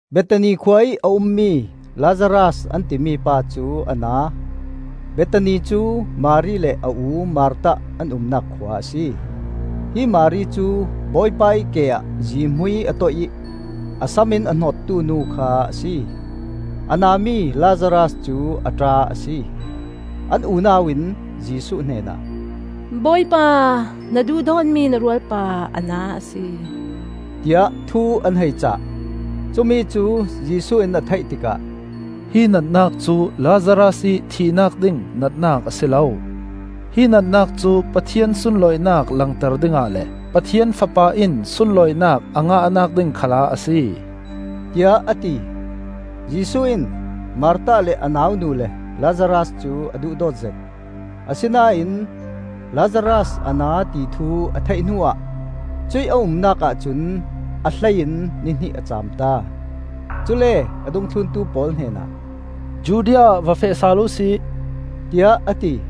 Bethani khua ih a ummi Lazaras an timi pa cu a na. Bethani cu Mari le a u Martha an umnak khua a si. Hi Mari cu Bawipa ih ke ah zihmui a toih ih a sam in a hnawttu nu kha a si. A na mi Lazaras cu a ṭa a si. An unau in Jesuh hnenah, “Bawipa, na duhdawtmi na rualpa a na a si,” tiah thu an hei cah. Cumi cu Jesuh in a theih tikah, “Hi natnak cu Lazaras ih thihnak ding natnak a si lo. Hi natnak cu Pathian sunlawinak langter dingah le Pathian Fapa in sunlawinak a ngahnak ding khalah a si,” tiah a ti. Jesuh in Martha le a nau nu le Lazaras cu a duhdawt zet. Asinain Lazaras a na ti thu a theih hnuah cuih a umnak ahcun a hlei in ni hnih a caam ta. Cule a dungthluntu pawl hnenah, “Judea ah va feh sal uhsi,” tiah a ti.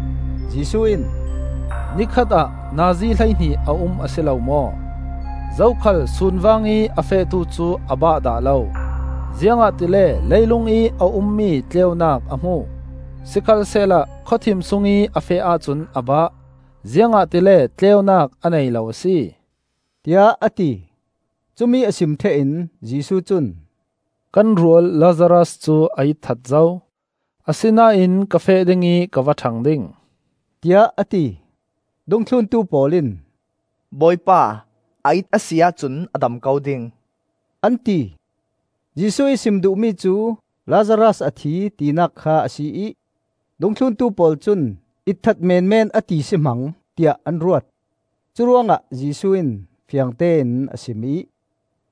Jesuh in, “Ni khatah nazi hleihnih a um a si lo maw? Zokhal sun vangih a fehtu cu a bah dah lo, ziangahtile leilungih a ummi tleunak a hmu. Sikhalsehla khawthim sungih a feh ahcun a bah, ziangahtile tleunak a nei lo a si,” tiah a ti. Cumi a sim ṭheh in Jesuh cun, “Kan rual Lazaras cu a itthat zo; asinain ka feh ding ih ka va ṭhang ding,” tiah a ti. Dungthluntu pawl in, “Bawipa, a it a si ahcun a dam ko ding,” an ti. Jesuh ih sim duhmi cu Lazaras a thi, tinak kha a si ih dungthluntu pawl cun itthat menmen a ti si hmang, tiah an ruat. Curuangah Jesuh in fiangtein a sim ih,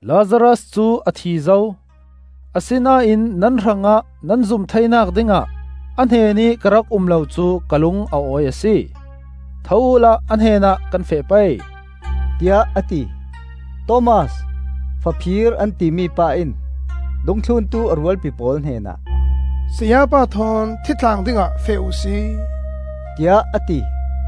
“Lazaras cu a thi zo; asinain nan hrangah nan zum theinak dingah a hnenih ka rak um lo cu ka lung a awi a si; tho uhla a hnenah kan feh pei,” tiah a ti. Thomas (Faphir an timi pa) in dungthluntu a rualpi pawl hnenah, “Sayapa thawn thi tlang dingah feh uhsi,” tiah a ti.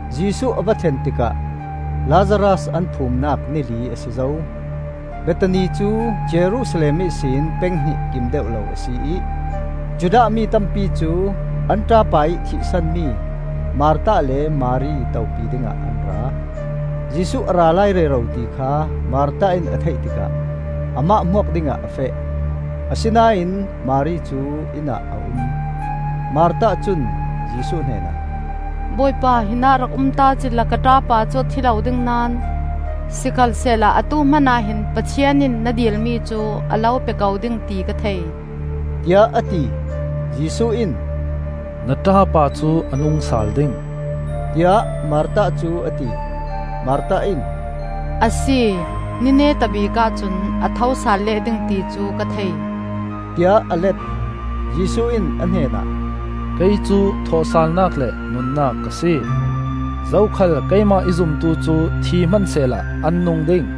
Jesuh a va thlen tikah Lazaras an phumnak ni li a si zo. Bethani cu Jerusalem ihsin peng hnih kim deuh lo a si ih, Judah mi tampi cu an ṭapa ih thih sanmi Martha le Mari topi dingah an ra. Jesuh a ra lai rero ti kha Martha in a theih tikah amah hmuak dingah a feh, asinain Mari cu inn ah a um. Martha cun Jesuh hnenah, “Bawipa, hinah rak um ta cila ka ṭapa cu a thi lo ding naón! Sikhalsehla atu hmanah hin Pathian in na dilmi cu a lo pe ko ding ti ka thei,” tiah a ti. Jesuh in, “Na ṭapa cu a nung sal ding,” tiah Martha cu a ti. Martha in, “A si, ni neta bikah cun a tho sal leh ding ti cu ka thei,” tiah a let. Jesuh in a hnenah, “Kei cu thawhsalnak le nunnak ka si. Zokhal keimah i zumtu cu thi hmansehla an nung ding.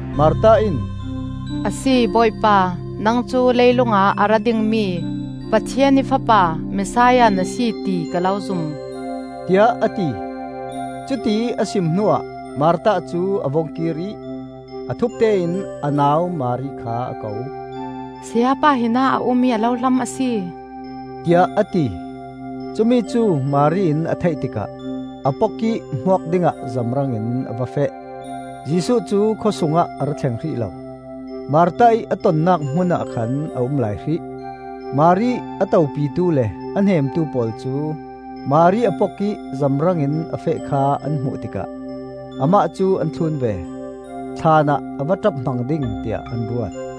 Martha in, “A si Bawipa, nang cu leilung ah a ra dingmi Pathian ih Fapa Messiah na si ti ka lo zum,” tiah a ti. Cutiih a sim hnuah Martha cu a vung kir ih a thupte in a nau Mari kha a ko. “Sayapa hinah a um ih a lo hlam a si,” tiah a ti. Cumi cu Mari in a theih tikah a pok ih hmuak dingah zamrangin a va feh. Jesuh cu khawsungah a ra thleng hrih lo; Martha ih a tonnak hmun ah khan a um lai hrih. Mari a topitu le a hnemtu pawl cu Mari a pok ih zamrangin a feh kha an hmuh tikah amah cu an thlun ve. Thlaan ah a va ṭap hmang ding tiah an ruat.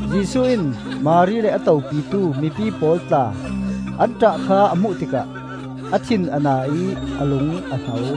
Jesuh in Mari le a topitu mipi pawl tla an ṭah kha a hmuh tikah a thin a na ih a lung a hno.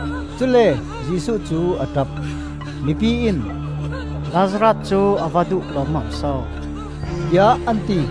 Cule Jesuh cu a ṭap. Mipi in, “Lazaras cu a va duhdawt lawmmam so!” tiah an ti.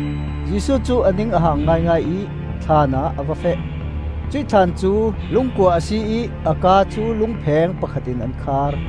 Jesuh cu a ning a hang ngaingai ih thlaan ah a va feh. Cuih thlaan cu lungkua a si ih a ka cu lungpheng pakhat in an khar.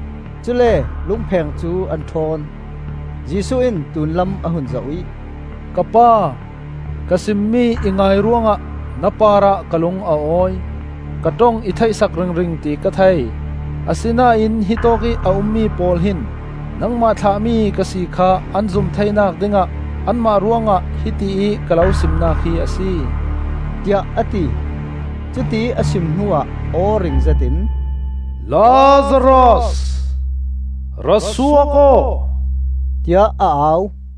Cule lungpheng cu an ṭhawn. Jesuh in tlunlam a hun zoh ih, “Ka Pa, ka simmi i ngai ruangah na parah ka lung a awi. Ka ṭong i theih sak ringring ti ka thei, asinain hitawk ih a ummi pawl hin nangmah thlahmi ka si kha an zum theinak dingah anmah ruangah hiti ih ka lo simnak hi a si,” tiah a ti. Cutiih a sim hnuah aw ring zetin, “Lazaras, ra suak aw!” tiah a au.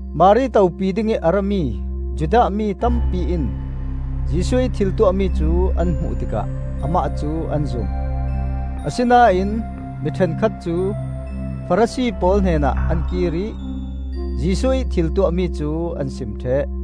Mari topi dingih a rami Judah mi tampi in Jesuh ih thil tuahmi cu an hmuh tikah amah cu an zum. Asinain mi ṭhenkhat cu Farasi pawl hnenah an kir ih Jesuh ih thil tuahmi cu an sim ṭheh.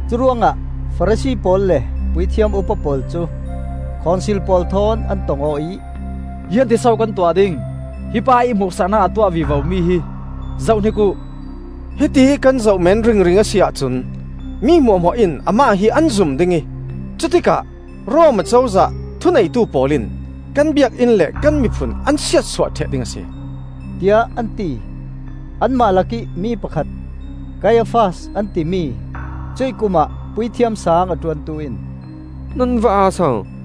Curuangah Farasi pawl le puithiam upa pawl cu Khonsil pawl thawn an tong aw ih, “Ziangtin so kan tuah ding? Hi pa ih hmuhsaknak a tuah vivomi hi zohhnik uh! Hitiih kan zoh men ringring a si ahcun mi hmuahhmuah in amah hi an zum ding ih cutikah Rom Acozah thuneitu pawl in kan Biakinn le kan miphun an siatsuah ṭheh ding a si,” tiah an ti. Anmah lakih mi pakhat, Kaiafas an timi, cuih kumah Puithiam Saang a ṭuantu in, “Nan va aa so!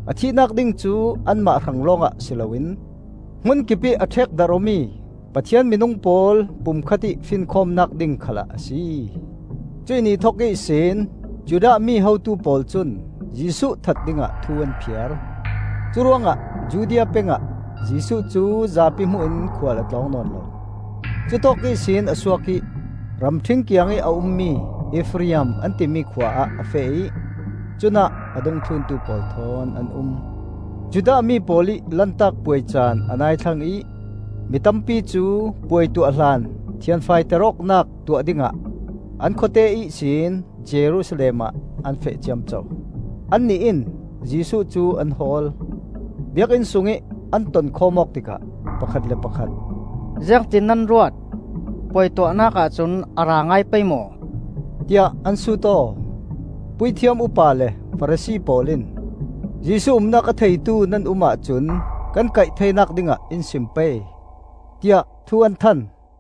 A thihnak ding cu anmah hrang lawngah si loin hmun kipih a ṭhekdarh awmi Pathian minung pawl pumkhat ih finkhawmnak ding khalah a si. Cuih ni thok ihsin Judah mi hotu pawl cun Jesuh that dingah thu an phiar. Curuangah Judea pengah Jesuh cu zapi hmuh in khual a tlawng nawn lo; cutawk ihsin a suak ih ramṭhing kiangih a ummi Efraim an timi khua ah a feh ih cunah a dungthluntu pawl thawn an um. Judah mi pawl ih Lantak Puai caan a nai thlang ih mi tampi cu puai tuah hlan thianfaiter awknak tuah dingah an khawte ihsin Jerusalem ah an feh ciamco. Annih in Jesuh cu an hawl; Biakinn sungih an tonkhawm awk tikah pakhat le pakhat, “Ziangtin nan ruat? Puai tuahnak ahcun a ra ngai pei maw?” tiah an sut aw. Puithiam upa le Farasi pawl in, “Jesuh umnak a theitu nan um ahcun kan kaih theinak dingah in sim pei,” tiah thu an than.